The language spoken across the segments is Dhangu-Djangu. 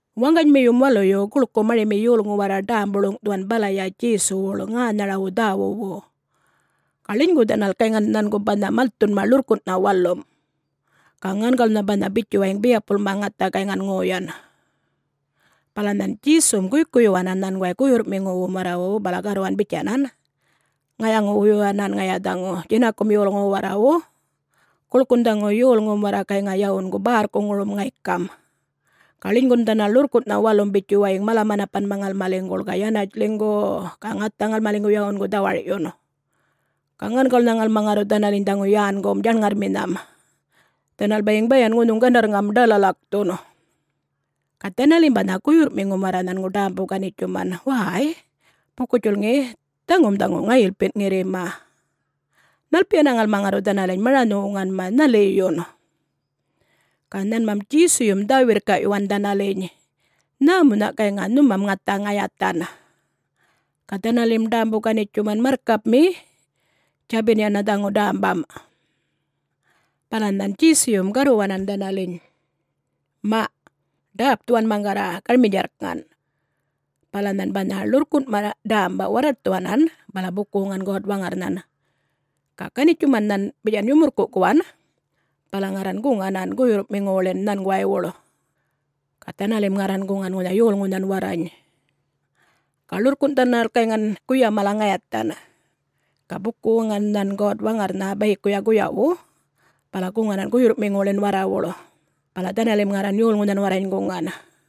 Waŋganymiyum waluyu guḻku marimi yolŋu warra ḏämbu-ḻuŋꞌthuwan balaya Djesuwuḻ ŋänharawu dhäwuwu. Ga ḻinygu dhanal gayŋa nhangu banha malthunma ḻurrkunꞌnha walum, ga ŋangawulnha banha bitjuwayiŋ biyapulma ŋatha gayŋan ŋoyan. Bala nhan Djesum guykuyyuwanan nhanguway guyurrꞌmiŋuwum warrawu bala garruwan bitjanan, “Ŋayaŋu-wuyuwanan ŋaya dhaŋu djinakum yolŋuwu warrawu. Guḻkun dhaŋu yolŋum warra gayŋa yawungu bärrkuŋurum ŋaykam ga ḻinygun dhanal ḻurrkunꞌnha walum bitjuwayiŋ mala-manapanma ŋalmaliŋguḻ ga yanatj ḻinygu-u-u ga ŋatha ŋalmaliŋgu yawungu dhawarꞌyun. Ga ŋangawulnha ŋalma ŋarru dhanaliny dhaŋu yängum djaṉŋarrminham, dhanal bayiŋ bayan ŋunhuŋ gandarrŋam ḏalalakthun.” Ga dhanalim banha guyurrꞌmiŋum warra nhangu ḏämbu-ganitjuman, “Wäy, buku-djulŋi dhaŋum dhaŋu ŋayilpinꞌ ŋirrima,... nhalpiyana ŋalma ŋarru dhanaliny maranhu-wuŋanma, nhaliyun?” Ga nhanmam Djesuyum dhä-wirrkaꞌyuwan dhanaliny, “Nhämunhaꞌ gayŋa nhumam ŋatha ŋayathan?” Ga dhanalim ḏämbu-ganitjuman, “Marrkapmi, djabin yana dhaŋu dämbam.” Bala nhan Djesuyum garruwanan dhanaliny, “Maꞌ ḏäpthuwan maŋgarra garminydjarrkŋan.” Bala nhan banha ḻurrkunꞌma ḏämba warraṯthuwanan bala buku-wuŋan God-Waŋarrnhan. Ga ganitjuman nhan bitjan yumurrkuꞌkuwan bala ŋarran guŋanan guyurrꞌmiŋuwuḻin nhanguwaywuḻ. Ga dhanalim ŋarran guŋan ŋunha yolŋunhan warrany. Ga ḻurrkunꞌ dhanal gayŋan guya mala ŋayathan. Ga buku-wuŋan nhan God-Waŋarrnha bayikuya guyawu, bala guŋanan guyurrꞌmiŋuwuḻin warrawuḻ bala dhanalim ŋarran yolŋunhan warrany guŋan.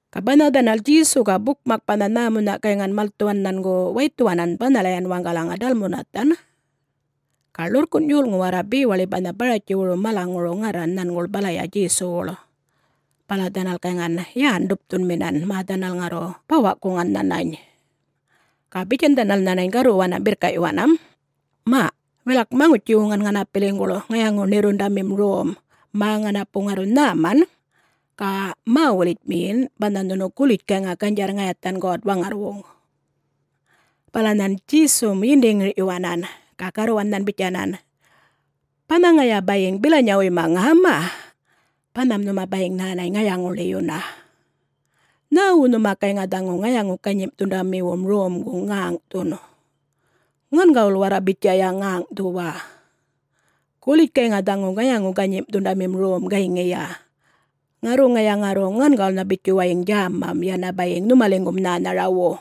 Ga banha dhanal Djesu ga bukmak banha nhämunha gayŋan malthuwan nhangu waythuwanan banhalayan waŋgalaŋa Dalmanuthan. Ga ḻurrkunꞌ yolŋu warra bewaḻi banha Baratjiwuru malaŋuru ŋarran nhanguḻ balaya Djesuwuḻ, bala dhanal gayŋan yän-ḏupthunminan mä dhanal ŋarru bawaꞌkuŋan nhanany. Ga bitjan dhanal nhanany garruwanam birrkaꞌyuwanam, “Maꞌ wilak maŋutji-wuŋan ŋanapiliŋguḻ ŋayaŋu-ṉirrundamim rom mä ŋanapu ŋarru nhäman ga mä-wulitjmiyin banha nhunu gulitj gayŋa ganydjarr ŋayathan God-Waŋarrwuŋ!”. Bala nhan Djesum yindi-ŋirꞌyuwanan ga garruwan nhan bitjanan, “Banha ŋaya bayiŋ bilanyawuyma ŋäma, banham nhuma bayiŋ nhänany ŋayaŋu-ḻiyuna! Nhäwu nhuma gayŋa dhaŋu ŋayaŋu-ganyimꞌthundamiwum romgu ŋäŋꞌthun? Ŋangawul warra bitjaya ŋäŋꞌthuwa. Gulitj gayŋa dhaŋu ŋayaŋu-ganyimꞌthundamim rom gayŋiya, ŋarru ŋaya ŋarru ŋangawulnha bitjuwayiŋ djämam, yana bayiŋ nhumaliŋgum nhänharawu.”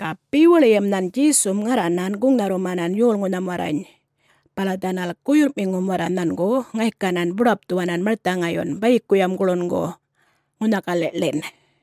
Ga bewaḻiyam nhan Djesum ŋarranan guŋnharrumanan yolŋunham warrany bala dhanal guyurrꞌmiŋum warra nhangu ŋaykanan buḏapthuwanan marthaŋayyun bayikuyam guḻungu, ŋunha galiꞌḻin.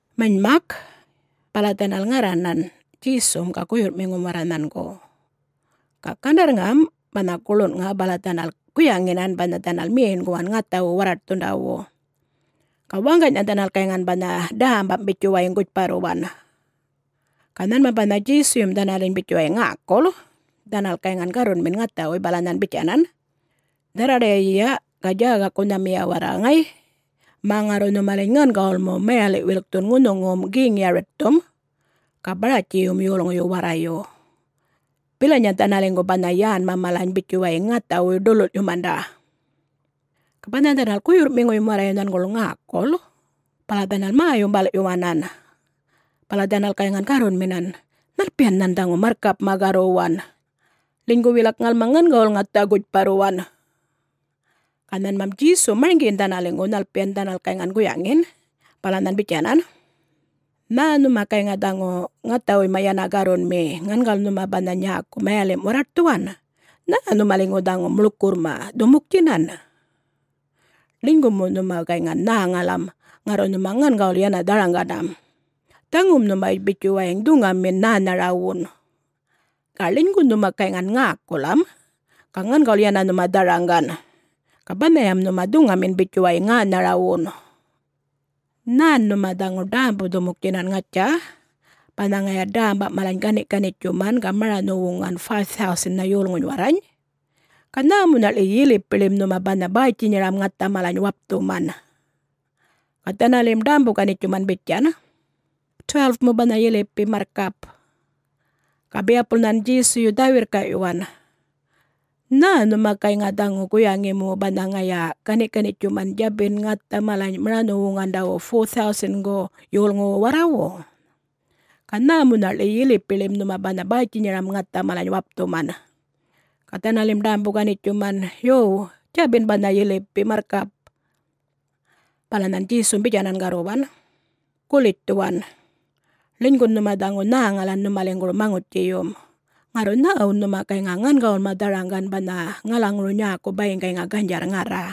Manymak, bala dhanal ŋarranan Djesum ga guyurrꞌmiŋum warra nhangu. Ga gandarrŋam banha guḻunŋa bala dhanal guyaŋinan banha dhanal meṉguwan ŋathawu warraṯthundawu. Ga waŋganynha dhanal gayŋan banha dämbam bitjuwayiŋ gutjparruwan. Ga nhanmam banha Djesuyum dhanaliny bitjuwayiŋ ŋäkul, dhanal gayŋan garrunmin ŋathawuy bala nhan bitjanan, “Dharraḏayiya, ga djägakunhamiya warra, ŋay, mä ŋarru nhumaliny ŋangawul mu mayaliꞌ-wilkthun ŋunhuŋum Geŋ Yaritthum ga Baratjiyum yolŋuyu warrayu. Bilanya dhanaliŋgu banha yänma malany bitjuwayiŋ ŋathawuy ḏululꞌyumanda.” Ga banha dhanal guyurrꞌmiŋuyum warrayu nhanguḻ ŋäkul bala dhanal mä-yumbalꞌyuwanan. Bala dhanal gayŋan garrunminan, “Nhalpiyan nhan dhaŋu marrkapꞌma garruwan,... linygu wilak ŋalma ŋangawul ŋatha gutjparruwan?” Ga nhanmam Djesum marŋgiyin dhanaliŋgu nhalpiyan dhanal gayŋan guyaŋin, bala nhan bitjanan, “Nhä nhuma gayŋa dhaŋu ŋathawuyma yana garrunmi... ŋangawul nhuma banha nyäku mayalimꞌ warraṯthuwan? Nhä nhumaliŋgu dhaŋu muḻkurrma dhumuktjinan? Ḻinygu mu nhuma gayŋan nhäŋalam, ŋarru nhuma ŋangawul yana dharaŋganam. Dhaŋum nhuma bitjuwayiŋ dhuŋamin nhänharawun. Ga ḻinygu nhuma gayŋan ŋäkulam, ga ŋangawul yana nhuma dharaŋgan, ga banhayam nhuma dhuŋamin bitjuwayiŋ ŋänharawun. Nhän nhuma dhaŋu ḏämbu-dhumuktjinan, ŋatja? banha ŋaya dämba malany ganiꞌ-ganitjuman ga maranhu-wuŋan 5000-nha yolŋuny warrany? Ga nhämunhaꞌḻi yilipiḻim nhuma banha bäytjinyaram ŋatha malany wapthuman?” Ga dhanalim ḏämbu-ganitjuman bitjan, “12-mu banha yilipim, marrkap!” Ga biyapul nhan Djesuyu dhä-wirrka'yuwan, “Nhä nhuma gayŋa dhaŋu guyaŋi mu banha ŋaya gani'-ganitjuman djabin ŋatha malany maranhu-wuŋandawu 4000-gu yolŋuwu warrawu? Ga nhämunha'ḻi yilipiḻim nhuma banha bäytjinyaram ŋatha malany wapthuman?” Ga dhanalim ḏämbu-ganitjuman, “Yo, djabin banha yilipi marrkap!” Bala nhan Djesum bitjanan garruwan, “Gulitj dhuwan, ḻinygun nhuma dhaŋu nhäŋalan nhumaliŋguru maŋutjiyum, ŋarru nhäwun nhuma gayŋa ŋangawulma dharaŋgan banha ŋalaŋuru nyäku bayiŋ gayŋa ganydjarr ŋarra?”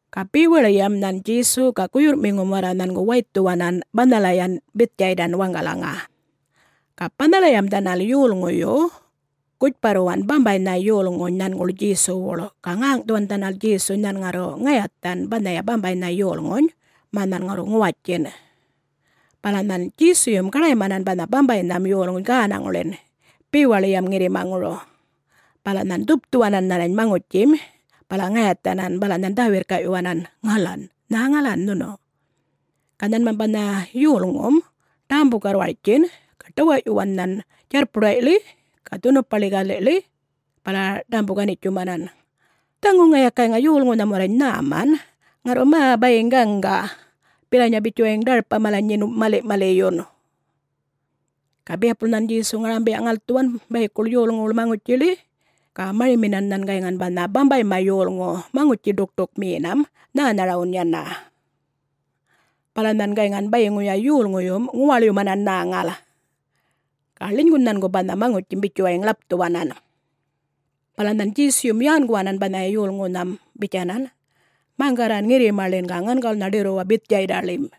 Ga bewaḻiyam nhan Djesu ga guyurrꞌmiŋum warra nhangu waythuwanan banhalayan Bithdjaydan waŋgalaŋa. Ga banhalayam dhanal yolŋuyu gutjparruwan bambaynha yolŋuny nhanguḻ Djesuwuḻ, ga ŋäŋꞌthuwan dhanal Djesuny nhan ŋarru ŋayathan banhaya bambaynha yolŋuny mä nhan ŋarru ŋuwatjin. Bala nhan Djesuyum gaḏaymanan banha bambaynham yolŋuny gänaŋuḻin bewaḻiyam ŋirrimaŋuru. Bala nhan dhupthuwanan nhanany maŋutjim bala ŋayathanan, bala nhan dhä-wirrkaꞌyuwanan, “Ŋalan, nhäŋalan... nhunu?” Ga nhanmam banha yolŋum ḏämbu-garrwartjin ga ḏawaꞌyuwan nhan djarrpuḏayḻi ga dhunupaḻi galiḻi, bala ḏämbu-ganitjumanan, “Dhaŋu ŋaya gayŋa yolŋunham warrany nhäman, ŋarru mä bayiŋ gaŋga, bilanyan bitjuwayiŋ ḏarpa malany nyin maliꞌ-maliꞌyun!” Ga biyapulya nhan Djesu ŋarambiya-ŋalthuwan bayikuḻ yolŋuwuḻ maŋutjiḻi. Ga marimanan nhan gayŋan banha bambayma yolŋu maŋutji-ḏukṯukmiyinam nhänharawun yana. Bala nhan gayŋan bayiŋuya yolŋuyum ŋuwaḻyumanan nhäŋal. Ga ḻinygun nhangu banha maŋutjim bitjuwayiŋ ḻapthuwanan. Bala nhan Djesuyum yänguwanan banhaya yolŋunham bitjanan, “Maŋgarran ŋirrimaḻin, ga ŋangawulnha ḏirruwa Bithdjaydaḻim.”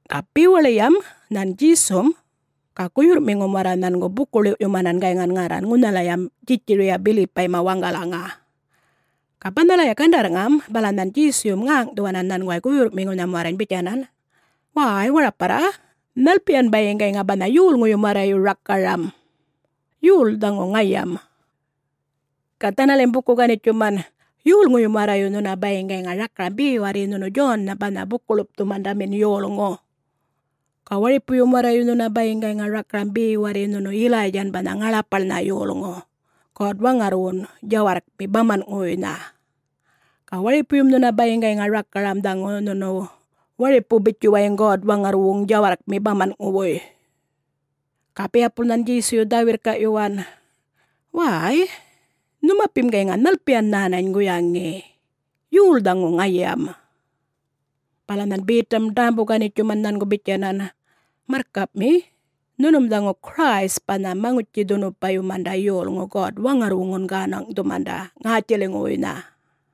Ga bewaḻiyam nhan Djesum ga guyurrꞌmiŋum warra nhangu buku-ḻiwꞌyumanan gayŋan ŋarran ŋunhalayam Djitjariya Bilipayma waŋgalaŋa. Ga banhalaya gandarrŋam bala nhan Djesuyum ŋäŋꞌthuwanan nhanguway guyurrꞌmiŋunham warrany bitjanan, “Wäy, waraparra, nhalpiyan bayiŋ gayŋa banha yolŋuyum warrayu rakaram,... yol dhaŋu ŋayam?” Ga dhanalim buku-ganitjuman, “Yolŋuyum warrayu nhuna bayiŋ gayŋa rakaram be warri nhunu Djonnha banha Buku-ḻupthumandamin yolŋu. Ga waripuyum warrayu nhuna bayiŋ gayŋa rakaram be warri nhunu Yilaydjan banha ŋaḻapaḻnha yolŋu God-Waŋarrwun djawarrkmi bamanꞌŋuwuynha. Ga waripuyum nhuna bayiŋ gayŋa rakaram dhaŋu nhunu waripu bitjuwayiŋ God-Waŋarrwuŋ djawarrkmi bamanꞌŋuwuy.” Ga biyapul nhan Djesuyu dhä-wirrkaꞌyuwan, “Wäy-y, nhumapim gayŋa nhalpiyan nhänany guyaŋi,... yol dhaŋu ŋayam?” Bala nhan Betam ḏämbu-ganitjuman nhangu bitjanan, “Marrkapmi, nhunum dhaŋu Christ banha Maŋutji-dhunupayumanda yolŋu God-Waŋarrwuŋun gänaŋꞌthumanda ŋätjiliŋuwuynha.”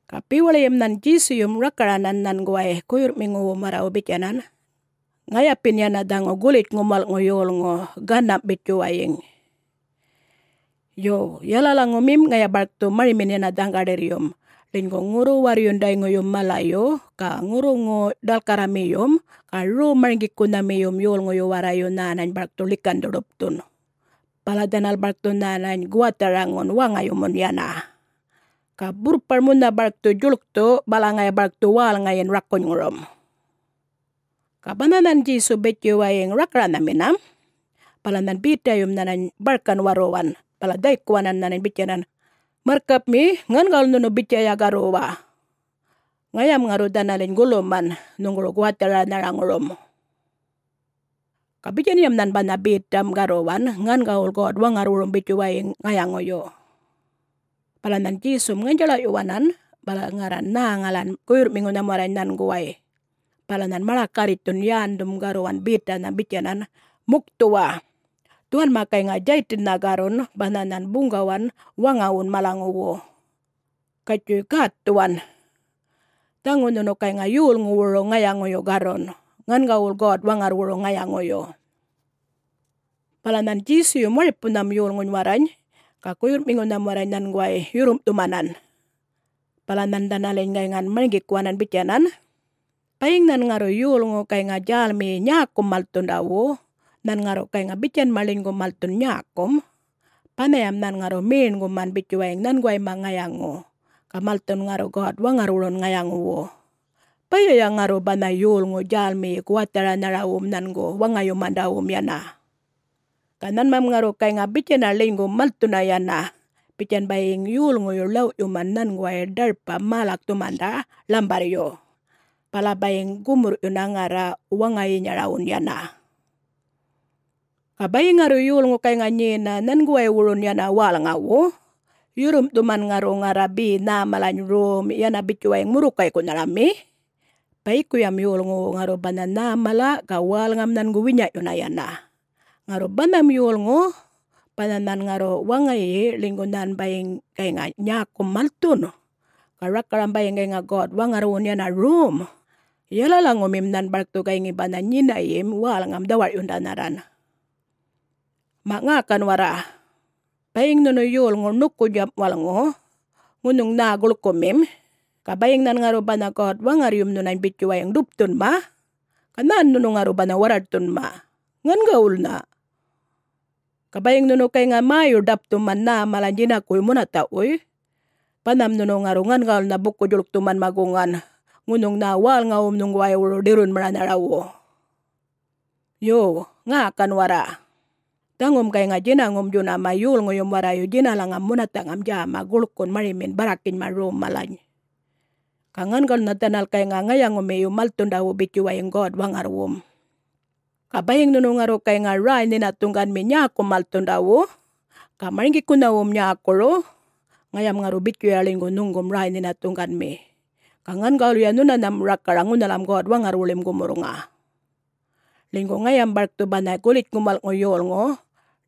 Ga bewaḻiyam nhan Djesuyum rakaranan nhanguway guyurr'miŋuwum warrawu bitjanan, “Ŋayapin yana dhaŋu Gulitjŋum Wal'ŋu Yolŋu, ganam' bitjuwayiŋ. Yo, yalalaŋumim ŋaya barkthu marimin yana dhaŋgaḏirryum ḻinygu ŋurru-warrundayŋuyum malayu ga ŋurruŋu-ḏalkarramiyum ga rom-marŋgikunharamiyum yolŋuyu warrayu nhänany barkthu ḻikandhu-ḏupthun, bala dhanal barkthu nhänany guwatharaŋun waŋayumun yana. Ga burrpar munha barkthu djuḻkthu bala ŋaya barkthu wälŋayin rakunyŋurum.” Ga banha nhan Djesu bitjuwayiŋ rakaranhaminam, bala nhan Betayum nhanany barkan warruwan bala dhaykuwanan nhanany bitjanan, “Marrkapmi, ŋangawul nhunu bitjayam garruwa! Ŋayam ŋarru dhanaliny guluman nhuŋguru guwatharanharaŋurum.” Ga bitjanyam nhan banha Betam garruwan ŋangawul God-Waŋarrwurum bitjuwayiŋ ŋayaŋuyu. Bala nhan Djesum ŋanydjaḻaꞌyuwanan bala ŋarran nhäŋalan guyurrꞌmiŋunham warrany nhanguway, bala nhan maḏakarritjthun yändhum garruwan Betanham bitjanan, “Mukthuwa! Dhuwanma gayŋa Djaytinnha garrun banha nhan buŋgawan waŋawun malaŋuwu. Gatjuy gätthuwan. Dhaŋu nhunu gayŋa yolŋuwuru ŋayaŋuyu garrun, ŋangawul God-Waŋarrwuru ŋayaŋuyu.” Bala nhan Djesuyum waripunham yolŋuny warrany ga guyurrꞌmiŋunham warrany nhanguway yurrumꞌthumanan, bala nhan dhanaliny gayŋan marŋgikuwanan bitjanan, “Bayiŋ nhan ŋarru yolŋu gayŋa djälmiyi nyäkum malthundawu, nhan ŋarru gayŋa bitjanma ḻinygu malthun nyäkum, banhayam nhan ŋarru meṉguman bitjuwayiŋ nhanguwayma ŋayaŋu ga malthun ŋarru God-Waŋarrwurun ŋayaŋuwu, bayaya ŋarru banha yolŋu djälmiyi guwatharanharawum nhangu waŋayumandawun yana. Ga nhanmam ŋarru gayŋa bitjana ḻinygun malthuna yana, bitjan bayiŋ yolŋuyu ḻawꞌyuman nhanguway ḏarpa-mälakthumanda ḻambarryu, bala bayiŋ gumurrꞌyuna ŋarra waŋayinyarawun yana. Ga bayiŋ ŋarru yolŋu gayŋa nyena nhanguwaywurun yana wälŋawu, yurrumꞌthuman ŋarru ŋarra be nhä malany rom, yana bitjuwayiŋ murrukaykunharami, bayikuyam yolŋuwu ŋarru banha nhäm mala ga wälŋam nhangu winyaꞌyuna yana. Ŋarru banham yolŋu, banha nhan ŋarru waŋayi ḻinygu nhan bayiŋ gayŋa nyäkum malthun, ga rakaram bayiŋ gayŋa God-Waŋarrwun yana rom, yalalaŋumim nhan barkthu gayŋi banha nyinayim wälŋam dhawarꞌyundanharran. Maꞌ ŋäkan warra! Bayiŋ nhunu yolŋu ṉukunydjam walꞌŋu, ŋunhuŋ nhä guḻkuꞌmim, ga bayiŋ nhan ŋarru banha God-Waŋarryum nhunany bitjuwayiŋ ḏupthunma, ga nhän nhunu ŋarru banha warraṯthunma? Ŋangawulnha! Ga bayiŋ nhunu gayŋa mäyu-ḏapthuman nhä malany djinakuwuy munathaꞌwuy, banham nhunu ŋarru ŋangawulnha buku-djuḻkthumanma guŋan ŋunhuŋ nhä wälŋawum nhuŋguwaywuru ḏirrunmaranharawu! Yo, ŋäkan warra! Dhaŋum gayŋa djinaŋum djunama yolŋuyum warrayu djinalaŋam munathaꞌŋam djäma guḻkun marimin barrakinyma rom malany. Ga ŋangawulnha dhanal gayŋa ŋayaŋumiyu malthundawu bitjuwayiŋ God-Waŋarrwum. Ga bayiŋ nhunu ŋarru gayŋa räy-nhinathuŋganmi nyäkum malthundawu, ga marŋgikunhawum nyäkuru, ŋayam ŋarru bitjuya ḻinygu nhuŋgum räy-nhinathuŋganmi, ga ŋangawulya nhunanham rakaraŋ ŋunhalam God-Waŋarrwuḻim gumurrŋa. Ḻinygu ŋayam barkthu banha Gulitjŋum Walꞌŋu Yolŋu,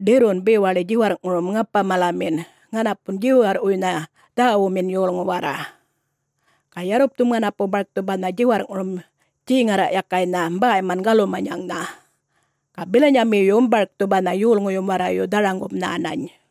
ḏirrun bewaḻi djiwarrꞌŋurum ŋapa-malamin ŋanapun djiwarrꞌwuynha dhäwumin yolŋu warra. Ga yarrupthum ŋanapu barkthu banha djiwarrꞌŋurum djeŋarraꞌyakaynha bäyman galumanyaŋnha, ga bilanyamiyun barkthu banha yolŋuyum warrayu dharaŋgum nhänany.